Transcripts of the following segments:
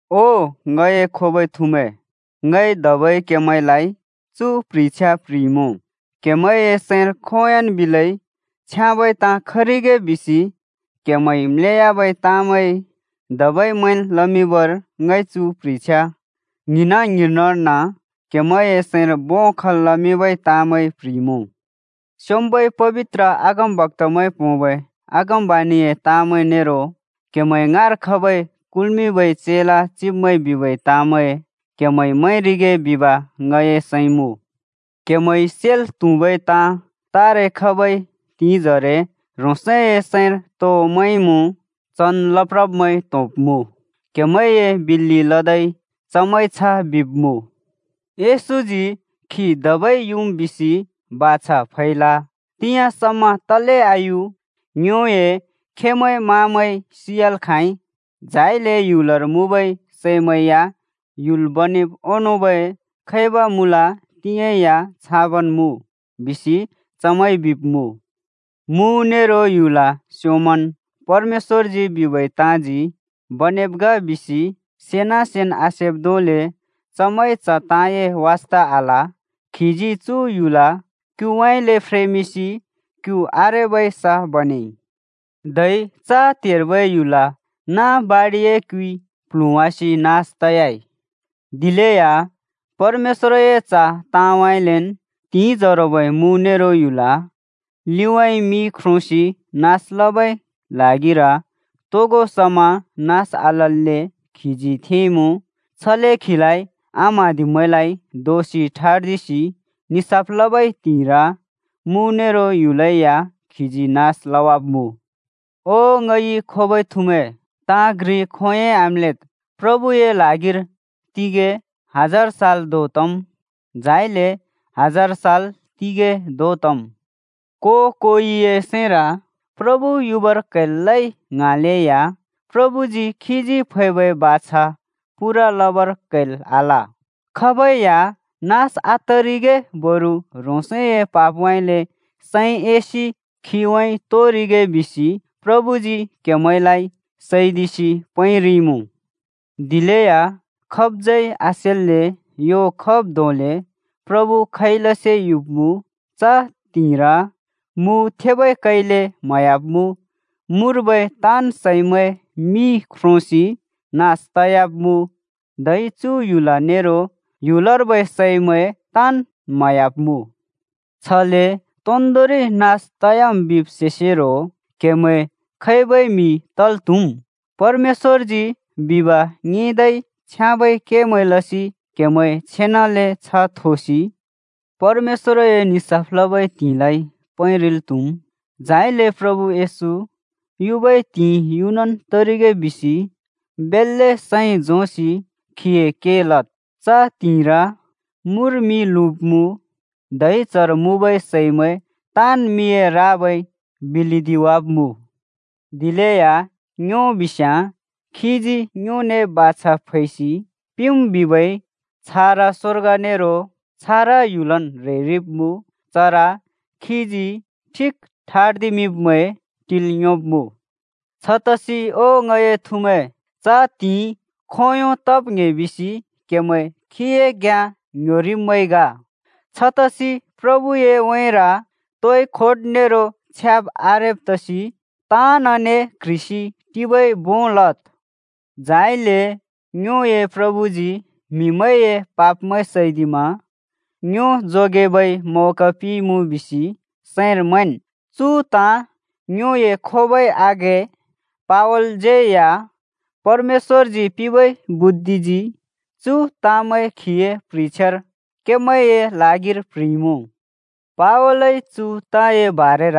ओ ङए खोबै थुमैं, ङइ धबै क्‍हेमैंलाइ चु प्ह्रिछ्या प्ह्रिइमुँ। क्‍हेमैंए सैंर खोंयोंन् बिलै छ्याँबै ताँ खरिगे बिसि क्‍हेमैंइ म्‍लेयाबै ताँमैं धबै मैंल् लमिंबर ङइ चु प्ह्रिछ्या ङ्हिंना-ङ्हिंनर्न क्हेमैंए सैंर भों खल् लमिंबै ताँमैं प्ह्रिइमुँ। स्‍योंम्‍बै पबित्र अगमबक्‍तामैंइ पोंबै अगमबाणिए ताँमैं नेरो क्‍हेमैं ङाँर खबै कुल्मिंबै चेला चिब्मैंइ बिबै ताँमैं क्हेमैंइ मैंरिगे बिब ङए सैं मुँ। क्हेमैंइ सेल् त्हुबै ताँ: तारे खबै त्हिंइ जरे ह्रोंसए सैंर तो मैंमुँ, चन् लप्रब्मैं त्‍होंब्‍मुँ। क्हेमैंए बिल्‍लि लदै चमैंइ छ बिब्मुँ, “येशूजी खी धबै युम् बिसि बाछा फैल। तिंयाँ समा तले आयु? ङ्योए खेमैं-माँमैं सियाल् खाँइ, झाइले ह्‍युलर मुँबै सैमैं या ह्‍युल् बनेब् ओंनोंबै खैब मुँल तिंयाँ या छाबन् मुँ!” बिसि चमैंइ बिब्मुँ। मु नेरो ह्‍युल स्योंमन् परमेश्‍वरजी बिबै ताँजी बनेब् ग बिसि सेना सेन् आसेब् धोंले चमैंइ च ताँए वास्ता आल। खीजी चु ह्‍युल क्‍युउँइँले फ्रेमिंसि क्यु आरेबै स बनेइ। धै च त्हेर्बै ह्‍युल नाँ बाडिए क्युइ प्ल्हुँवासि नास तयाइ। दिलेया परमेश्‍वरए च ताँउँइँलेन् तिंजरोबै मु नेरो ह्‍युल लिउँइँ मिइ ख्रोंसि नास लबै ल्हागिर तोगो समा नास आतल्‍ले खीजी थेंइमुँ। छले खीलाइ आम्हाँदिब्मैंलाइ दोषि ठर्दिसि निसाफ लबै त्हिंइर मु नेरो ह्‍युलै या खीजी नास लवाब्मुँ। ओ ङइ खोबै थुमैं, ताँ घ्रि खोंयोंइ आम्‍लेद्। प्रभुए ल्हागिर तिगैं हजार साल धों तम्, झाइले हजार साल तिगैं धों तम्। को-कोइए सैंर “प्रभु युबर क्‍हैल् लइ,” ङ्हाँलेया प्रभुजी खीजी फैबै बाछा पूरा लबर क्हैल् आल। खाबै या नास आतरिगे बरु ह्रोंसए पापउँइँले सैं एसि खिउँइँ तोरिगे बिसि प्रभुजी क्हेमैंलाइ सैदिसि पैंरिइमुँ। दिलेया खाबज्यै आसेल्‍ले ह्‍यो खब् धोंले प्रभु खैलसे युब्‍मुँ। च त्हिंइर मु थेबै कैले म्हयाब्मुँ, मुर्बै ताँन् सैमैं मिइ ख्रोंसि नास तयाब्मुँ, धै चु ह्‍युल नेरो ह्‍युलर्बै सैमैं ताँन् म्हयाब्‍मुँ। छले तोन्दोंरि नास तयाम् बिब् सेसेरो क्हेमैं खैबै म्‍हि तल् त्‍हुम्? परमेश्‍वरजी बिब ङिंदै छ्याँबै केमैं लसि क्हेमैं छेनाले छ्ह थोसि परमेश्‍वरए निसाफ लबै त्हिंइलाइ पैंरिल् त्‍हुम्। झाइले प्रभु येशू युबै त्हिंइ युनन तरिगे बिसि बेल्‍ले सैं झोंसि खीए के लद्। च त्हिंइर मुर मि लुँब्मुँ, धै चर मुँबै सैमैं ताँन् मिए राबाइ बिलिदिवाब्‍मुँ। दिलेया ङ्यो बिस्याँ खीजी ङ्योने बाछा फैसि पिंम् बिबै छारा स्वर्ग नेरो छारा ह्‍युलन् ह्रेरिब्मुँ। चर खीजी ठिक ठर्दिमिंब्मैं टिल् योंब्मुँ। छतसि ओ ङए थुमैं, च त्हिंइ खोंयों तब् ङ्‍हे बिसि क्हेमैं खीए घ्‍याँ ङ्ह्‍योब्मैं ग। छतसि प्रभुए उँइँर तोइ खोट नेरो छ्याब् आरेब् तसि ताँनने क्ह्रिसि टिबै भों लद्। झाइले ङ्योए प्रभुजी म्‍हिमैंए पापमैं सैदिमा ङ्यो जोगेबै मौका पिंइमुँ बिसि सैंर मैंन्। चु ताँ ङ्योए खोबै आघें पावलज्यै या परमेश्‍वरजी पिंबै बुद्धिजी चु ताँमैं खीए प्ह्रिछ्यार क्‍हेमैंए ल्हागिर प्ह्रिइमुँ। पावलइ चु ताँए बारेर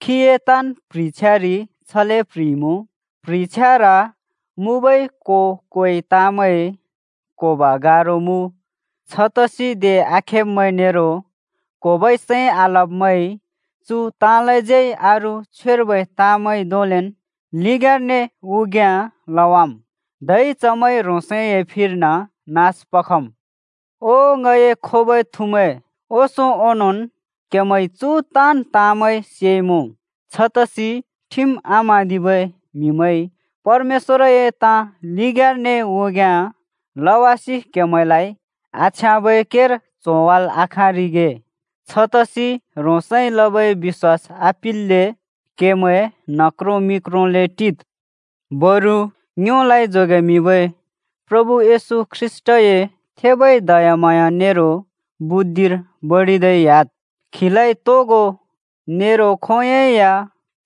खीए ताँन् प्ह्रिछ्यारि छले प्ह्रिइमुँ। प्ह्रिछ्यार मुँबै को-कोइ ताँमैं क्‍होब गारो मुँ। छतसि दे आखेब्‍मैं नेरो क्‍होबै सैं आलब्‍मैंइ चु ताँलाज्यै अरू छ्वेर्बै ताँमैं धोंलेन् लिग्याँने उग्याँ लवाम्। धै चमैंइ ह्रोंसए फिर्न नास पखम्। ओ ङए खोबै थुमैं, ओंसों ओंनोंन् क्हेमैंइ चु ताँन् ताँमैं सेइमुँ। छतसि ठिम आम्हाँदिबै म्हिमैंइ परमेश्‍वरए ताँ लिग्याँने उग्याँ लवासि क्हेमैंलाइ आछ्याँबै केर च्होवाल् आखाँरिगे, छतसि ह्रोंसइ लबै बिश्‍वास आपिल्‍ले क्हेमैं न्ह क्रों मि क्रोंले टिद्। बरु ङ्योलाइ जोगेमिंबै प्रभु येशू ख्रीष्‍टए थेबै दयाम्हाँया नेरो बुद्धिर बडिदै ह्‍याद्। खीलाइ तोगो नेरो खोंयोंइ या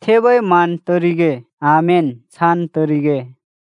थेबै मान तरिगे। आमेन, छान् तरिगे।